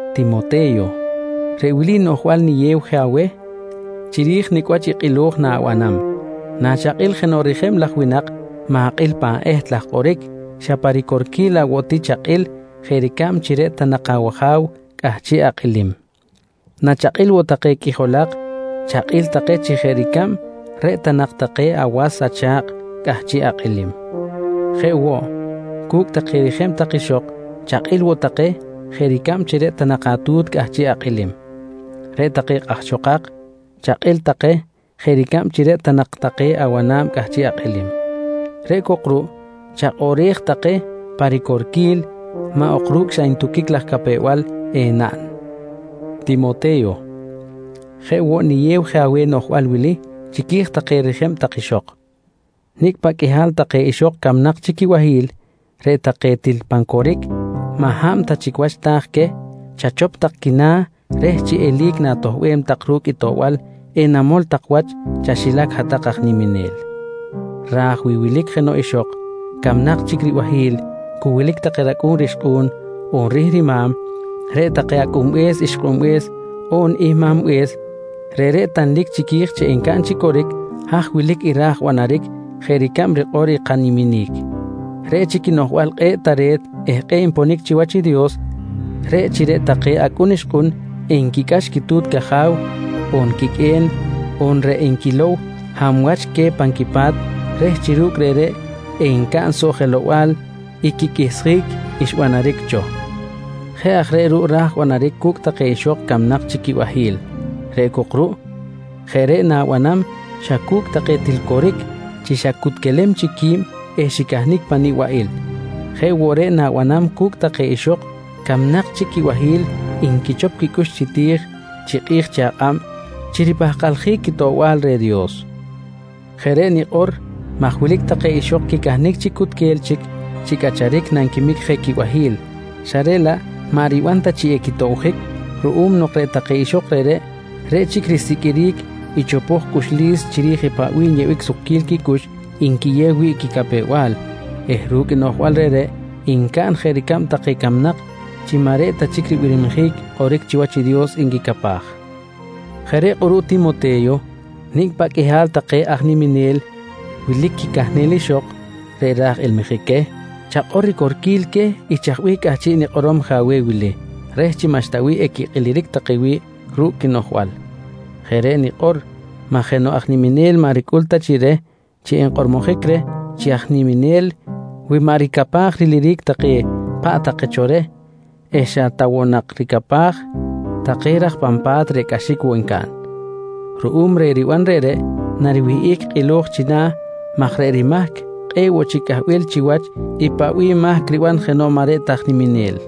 Timote̱yo, reꞌ wili noꞌjbal niyew je aweh chiri̱j nicꞌ wach i kꞌilo̱j na̱banam: Nachakꞌil jenoꞌ rijeb laj winak ma̱kꞌil pan eht laj kꞌoric xa pa ricorquil laꞌ woꞌ ti chakꞌil jeꞌ ricab chi reꞌ ta nak awaja̱w cꞌahchiꞌ akꞌilim. Nachakꞌil woꞌ take qꞌuijolak chakꞌil take chi jeꞌ ricab reꞌ ta nak take awas on acha̱kꞌ cꞌahchiꞌ akꞌilim. Jeꞌ woꞌ cu̱cꞌ take rijeb tak ixok, chakꞌil woꞌ take jeꞌ ricab reꞌ ta nak atu̱t cꞌahchiꞌ akꞌilim. Reꞌ take kꞌahxokak, chakꞌil take jeꞌ ricab chi reꞌ ta nak take awana̱b cꞌahchiꞌ akꞌilim. Reꞌ cok ruꞌ chakꞌoꞌrej take pa ricorquil maꞌ ok ru̱cꞌ xa ntuquic laj capew-bal enaꞌn. Timote̱yo, jeꞌ woꞌ niyew je aweh noꞌjbal wili chiqui̱j take rijeb tak ixok: Nicꞌ paꞌ qꞌuihal take ixok camnak chic quibahi̱l reꞌ take til pan coric maꞌ hab ta chic wach ta̱j queh chachop tak quina̱ reh chi eli̱c na̱toꞌbem tak ru̱cꞌ i toꞌbal enamol tak wach chaxilac hat-tak aj niminel. Raj wi wilic jenoꞌ ixok camnak chic ribahi̱l cu wilic take racꞌu̱n rixkꞌu̱n, on rihrima̱m, reꞌ take acꞌunbe̱s ixkꞌunbe̱s on ihmambe̱s reꞌreꞌ tanlic chiqui̱j chi encaꞌn chi coric haj wilic i ra̱j banaric jeꞌ ricab rikꞌor i kaniminic. Reꞌ chic i noꞌjbal kꞌe̱ꞌ tare̱t eh kꞌe̱ꞌ nponic chiwach i Dios, reꞌ chi reꞌ take acꞌun ixkꞌun enquicꞌax quitu̱t caja̱w on quiqꞌue̱n on reꞌ enquilow hab wach queh pan quipa̱t reh chi ru̱cꞌ reꞌreꞌ encaꞌn soꞌ jelow-bal i quiqꞌuihsjic xbanaric cho. Jeꞌ aj reꞌ ruꞌ ra̱j banaric cu̱cꞌ take ixok camnak chic quibahi̱l reꞌ cok ruꞌ, jeꞌ reꞌ na̱banam xa cu̱cꞌ take til coric chi xacutquelem chic qui̱b eh xicahnic pan nibaꞌil. Jeꞌ woꞌ reꞌ na̱banam cu̱cꞌ take ixok camnak chic quibahi̱l nquichop quicꞌux chi ti̱j chi kꞌi̱j chi akꞌab chi ripahkaljic quitoꞌbal reh Dios. Jeꞌ reꞌ nikꞌor maj wilic take ixok quicahnic chi cutquel chic chi cꞌacharic nanquimic je quibahi̱l xa reꞌ laꞌ maꞌ riban ta chi equitobjic ruꞌum nok reꞌ take ixok reꞌreꞌ, reꞌ chic risiqꞌuiric i chopoj cꞌuxlis chiri̱j paꞌ bih nyeꞌbic sukquil quicꞌux nquiyew wi̱ꞌ quicapew-bal eh ru̱cꞌ noꞌjbal reꞌreꞌ ncaꞌn jeꞌ ricab take camnak chi maꞌ reꞌ ta chic ribirmijic kꞌoric chiwach i Dios nquicapaj. Jeꞌ reꞌ kꞌuruꞌ Timote̱yo nicꞌ paꞌ qꞌuihal take aj niminel wilic quicahnel ixok reꞌ raj ilmijic queh, chakꞌor ricorquil queh i chaj bih cꞌahchiꞌ nikꞌorom je aweh wili reh chi maꞌxta bih equikꞌiliric take wi̱ꞌ ru̱cꞌ quinoꞌjbal. Jeꞌ reꞌ nikꞌor maj jenoꞌ aj niminel maꞌ ricꞌul ta chi reh chi enkꞌormojic reh chi aj niminel wi maꞌ ricapaj riliric take paꞌ take cho reh eh xa ta woꞌ nak ricapaj take raj pan pa̱t reꞌ cꞌaxic woꞌ ncaꞌn. Ruꞌum reh riban reꞌreꞌ, nariwihꞌic kꞌilo̱j china̱ maj reꞌ rimahc kꞌe̱ꞌ woꞌ chic cꞌahbil chiwach i paꞌ bih mahc riban jenoꞌ maꞌ reꞌ ta aj niminel.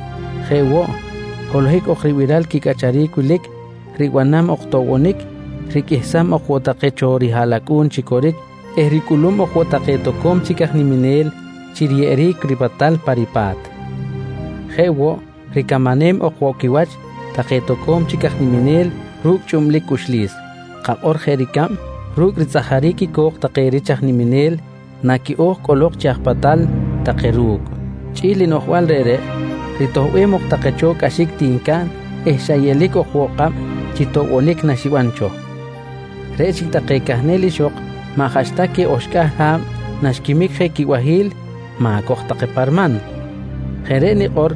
Jeꞌ woꞌ, holohic ok ribiral quicꞌacharic wilic, ribanam ok toꞌbonic, riqꞌuihsam ok woꞌ take cho rihaꞌlacꞌu̱n chi coric eh ricꞌulum ok woꞌ take toco̱m chic aj niminel chi riyeꞌeric ripatal pa ripa̱t. Jeꞌ woꞌ, ricamanem ok woꞌ quiwach take toco̱m chic aj niminel ru̱cꞌ chꞌublic cꞌuxlis, kakꞌor jeꞌ ricab ru̱cꞌ ritzꞌajaric i co̱k take rich aj niminel naquiꞌo̱j cꞌolok chi aj patal take ru̱cꞌ. Chꞌi̱l i noꞌjbal reꞌreꞌ, ritoꞌbem ok take cho cꞌaxic ti ncaꞌn eh xa yeꞌlic ok woꞌ kꞌab chi toꞌbonic naxiban cho. Reꞌ chic take cahnel ixok maꞌ jaꞌxta queh oxcꞌahl ha̱b naxquimic je quibahi̱l ma̱coj take pa riman. Jeꞌ reꞌ nikꞌor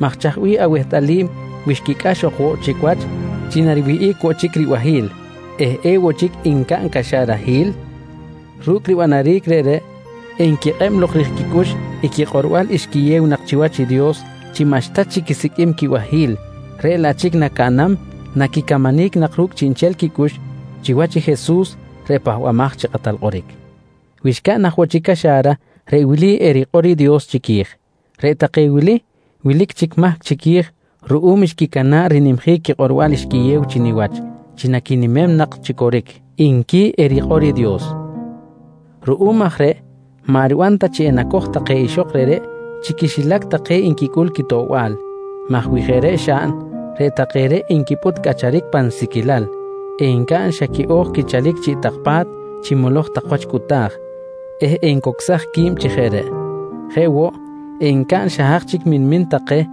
maj chaj bih awehtꞌalim wi xquicꞌax ok woꞌ chic wach chi nariwihꞌic woꞌ chic ribahi̱l eh ewoꞌ chic ncaꞌn caxarahil? Ru̱cꞌ ribanaric reꞌreꞌ, enquikꞌeb lok ri̱j quicꞌux i quikꞌorbal xquiyew nak chiwach i Dios chi maꞌxta chic quisiqꞌuim quibahi̱l reꞌ laꞌ chic nacaꞌnam, naquicamanic nak ru̱cꞌ chiꞌnchel quicꞌux chiwach i Jesus reꞌ Pahbamaj chi Kꞌatal Kꞌoric. Wi xcaꞌn aj woꞌ chic caxa̱ra, reꞌ wili erikꞌor i Dios chiqui̱j: «Reꞌ take wili wilic chic mahc chiqui̱j ruꞌum xquicana̱ꞌ rinimjic quikꞌorbal xquiyew chi niwach chi naquinimem nak chi coric, nqui erikꞌor i Dios. Ruꞌum aj reꞌ, maꞌ riban ta chi enacoj take ixok reꞌreꞌ chi quixilac take nquicꞌul quitoꞌbal maj wi jeꞌ reꞌ xaꞌn, reꞌ take reꞌ enquipꞌut cꞌacharic pan siquilal, encaꞌn xa quiꞌo̱j quichalic chiꞌ tak pa̱t chi moloj tak wach cꞌuta̱j eh encocsaj qui̱b chi jeꞌ reꞌ. Jeꞌ woꞌ, encaꞌn xa haj chic minmin take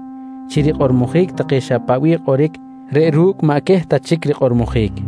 chi rikꞌormojic take xa paꞌ bih kꞌoric reꞌ ru̱cꞌ maꞌ queh ta chic rikꞌormojic.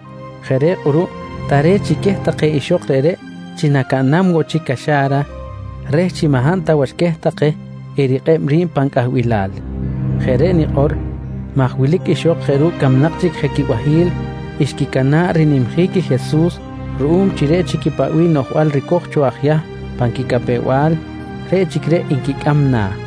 Jeꞌ reꞌ kꞌuruꞌ tare̱t chi queh take ixok reꞌreꞌ chi nacaꞌnam woꞌ chic caxa̱ra reh chi maꞌ hab ta wach queh take erikꞌeb ri̱b pan cꞌahbilal. Jeꞌ reꞌ nikꞌor maj wilic ixok jeꞌ ru̱cꞌ camnak chic je quibahi̱l xquicana̱ꞌ rinimjic i Jesus ruꞌum chi reꞌ chic i paꞌ bih noꞌjbal ricoj cho aj Yahm pan quicapew-bal, reꞌ chic reꞌ nquicꞌam na̱.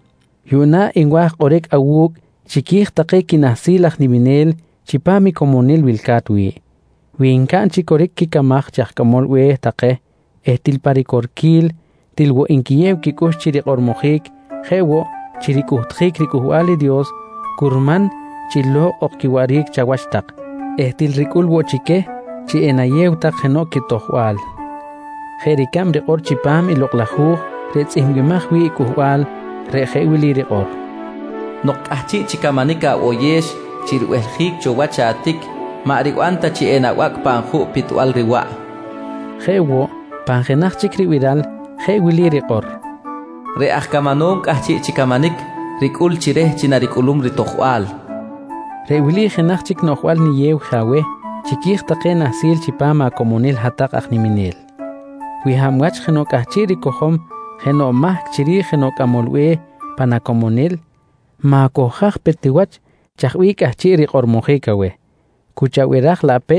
Yuꞌna nwa̱j kꞌoric awu̱cꞌ chiqui̱j take quinahsil aj niminel chipam i comonil wilca̱t wi̱ꞌ. Wi ncaꞌn chi coric quicamaj chi aj cꞌamol be̱h take eh til pa ricorquil, til woꞌ nquiyew quicꞌux chi rikꞌormojic jeꞌ woꞌ chi ricꞌuhtjic riCꞌuhbal i Dios, curman chi lo̱kꞌ ok quiwaꞌric chawach tak eh til ricꞌul woꞌ chi queh chi enayew tak jenoꞌ quitojbal jeꞌ ricab rikꞌor chipam Lokꞌ laj Hu̱j reꞌ tzꞌihmbimaj wi̱ꞌ cꞌuhbal reꞌ jeꞌ wili rikꞌor: “Nok cꞌahchiꞌ chi camanic aboyex chi ribehljic cho wach atic, maꞌ riban ta chi enabacꞌ pan juꞌ pitbal riwaꞌ, nqui rikꞌor. Jeꞌ woꞌ pan jenaj chic ribiral jeꞌ wili rikꞌor: “Reꞌ aj camanom cꞌahchiꞌ chi camanic ricꞌul chi reh chi naricꞌulum ritojbal, nqui rikꞌor. Reꞌ wili jenaj chic noꞌjbal niyew je aweh chiqui̱j take nahsil chipam acomonil hat-tak aj niminel: Wi hab wach jenoꞌ cꞌahchiꞌ ricojom jenoꞌ mahc chiri̱j jenoꞌ cꞌamol be̱h pan acomonil, ma̱cohjaj pe ti wach chaj bih cꞌahchiꞌ rikꞌormojic aweh. Cu chabiraj laꞌ pe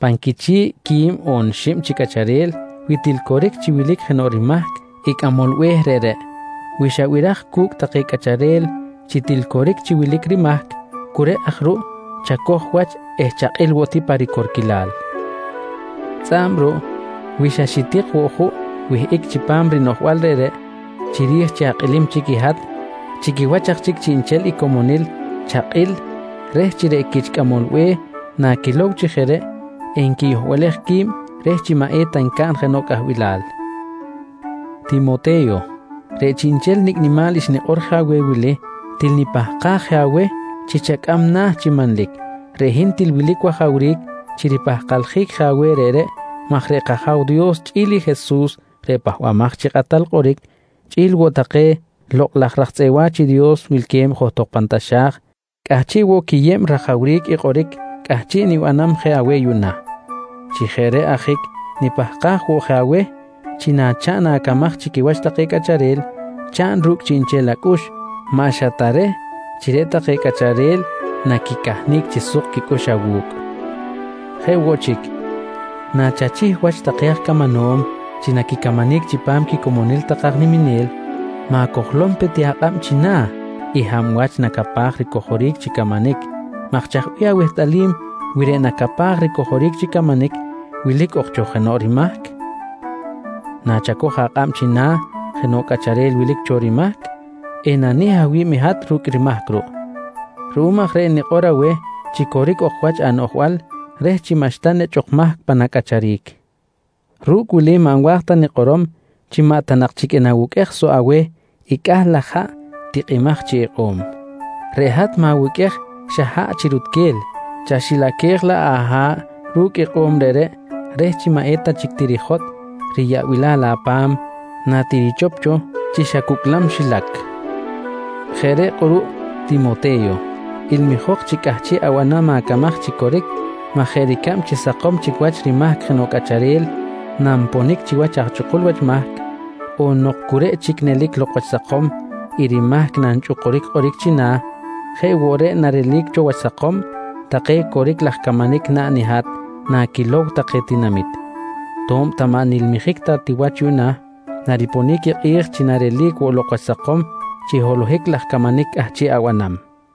pan quichi̱ꞌ quib xib ok chi cꞌacharel wi til coric chi wilic jenoꞌ rimahc i cꞌamol be̱h reꞌreꞌ. Wi xabiraj cu̱cꞌ take cꞌacharel chi til coric chi wilic rimahc, cu reꞌ aj ruꞌ chacoj wach eh chakꞌil woꞌ ti pa ricorquilal. Tzꞌa̱b ruꞌ wi xa xitik woꞌ juꞌ wihꞌic chipam rinoꞌjbal reꞌreꞌ chiri̱j chi akꞌilim chic i hat, chi quiwach aj chic chiꞌnchel i comonil chakꞌil reh chi reꞌ quich cꞌamol be̱h naquilow chi jeꞌ reꞌ, enquiyohbalej qui̱b reh chi maꞌ eta ncaꞌn jenoꞌ cꞌahbilal. Timote̱yo, reꞌ chiꞌnchel nicꞌ nimal xnikꞌor je aweh wili til nipahkaj je aweh chi chacꞌam na̱ chi manlic. Reꞌ hin til wilic wajawric chi ripahkaljic je aweh reꞌreꞌ maj reꞌ kAja̱w Dios chꞌi̱l i Jesus reꞌ Pahbamaj chi Kꞌatal Kꞌoric, chꞌi̱l woꞌ take lokꞌ laj raj tzꞌeꞌ wa̱ch i Dios wilque̱b johtok pan taxa̱j cꞌahchiꞌ woꞌ quiyeb rajawric i kꞌoric cꞌahchiꞌ nibanam je aweh yuꞌna. Chi jeꞌ reꞌ ajic nipahkaj woꞌ je aweh chi nachaꞌn acamaj chi quiwach take cꞌacharel, chaꞌn ru̱cꞌ chiꞌnchel acꞌux, maꞌ xa ta reh chi reꞌ take cꞌacharel naquicahnic chi suk quicꞌux awu̱cꞌ. Jeꞌ woꞌ chic, nachachih wach take aj camanom chi naquicamanic chipam quicomonil take aj niminel ma̱cojlom pe ti akꞌab china̱ i hab wach nacapaj ricojoric chi camanic maj chaj bih awehtꞌalim wi reꞌ nacapaj ricojoric chi camanic wilic ok cho jenoꞌ rimahc? Nachacoj akꞌab china̱ jenoꞌ cꞌacharel wilic cho rimahc, enanih awi̱b i hat ru̱cꞌ rimahc ruꞌ. Ruꞌum aj reꞌ nikꞌor aweh chi coric ok wach anoꞌjbal reh chi maꞌxta nechꞌ ok mahc pan acꞌacharic. Ru̱cꞌ wili maꞌ nwa̱j ta nikꞌorom chi maꞌ ta nak chic enawuqꞌuej soꞌ aweh i cꞌah laj haꞌ tikꞌimaj chi ikꞌo̱m. Reꞌ hat ma̱wuqꞌuej xa haꞌ chi rutquel, chaxilaquej laꞌ aha̱ꞌ ru̱cꞌ ikꞌo̱m reꞌreꞌ reh chi maꞌ eta chic tirijotꞌ riyaꞌbilal apa̱m natirichop cho chi xa cucꞌlam xilac. Jeꞌ reꞌ kꞌuruꞌ Timote̱yo, ilmijok chi cꞌahchiꞌ abanam acamaj chi coric maj jeꞌ ricab chi sakom chic wach rimahc jenoꞌ cꞌacharel nanponic chiwach aj chꞌukul wach mahc, on nok cu reꞌ chic nelic lok wach sakom i rimahc nanchꞌukuric kꞌoric china̱, jeꞌ woꞌ reꞌ narelic cho wach sakom take coric laj camanic naꞌn i hat naquilow take tinamit. To̱b ta maꞌ nilmijic ta ti wach yuꞌna, nariponic i kꞌi̱j chi narelic woꞌ lok wach sakom chi holohic laj camanic cꞌahchiꞌ abanam.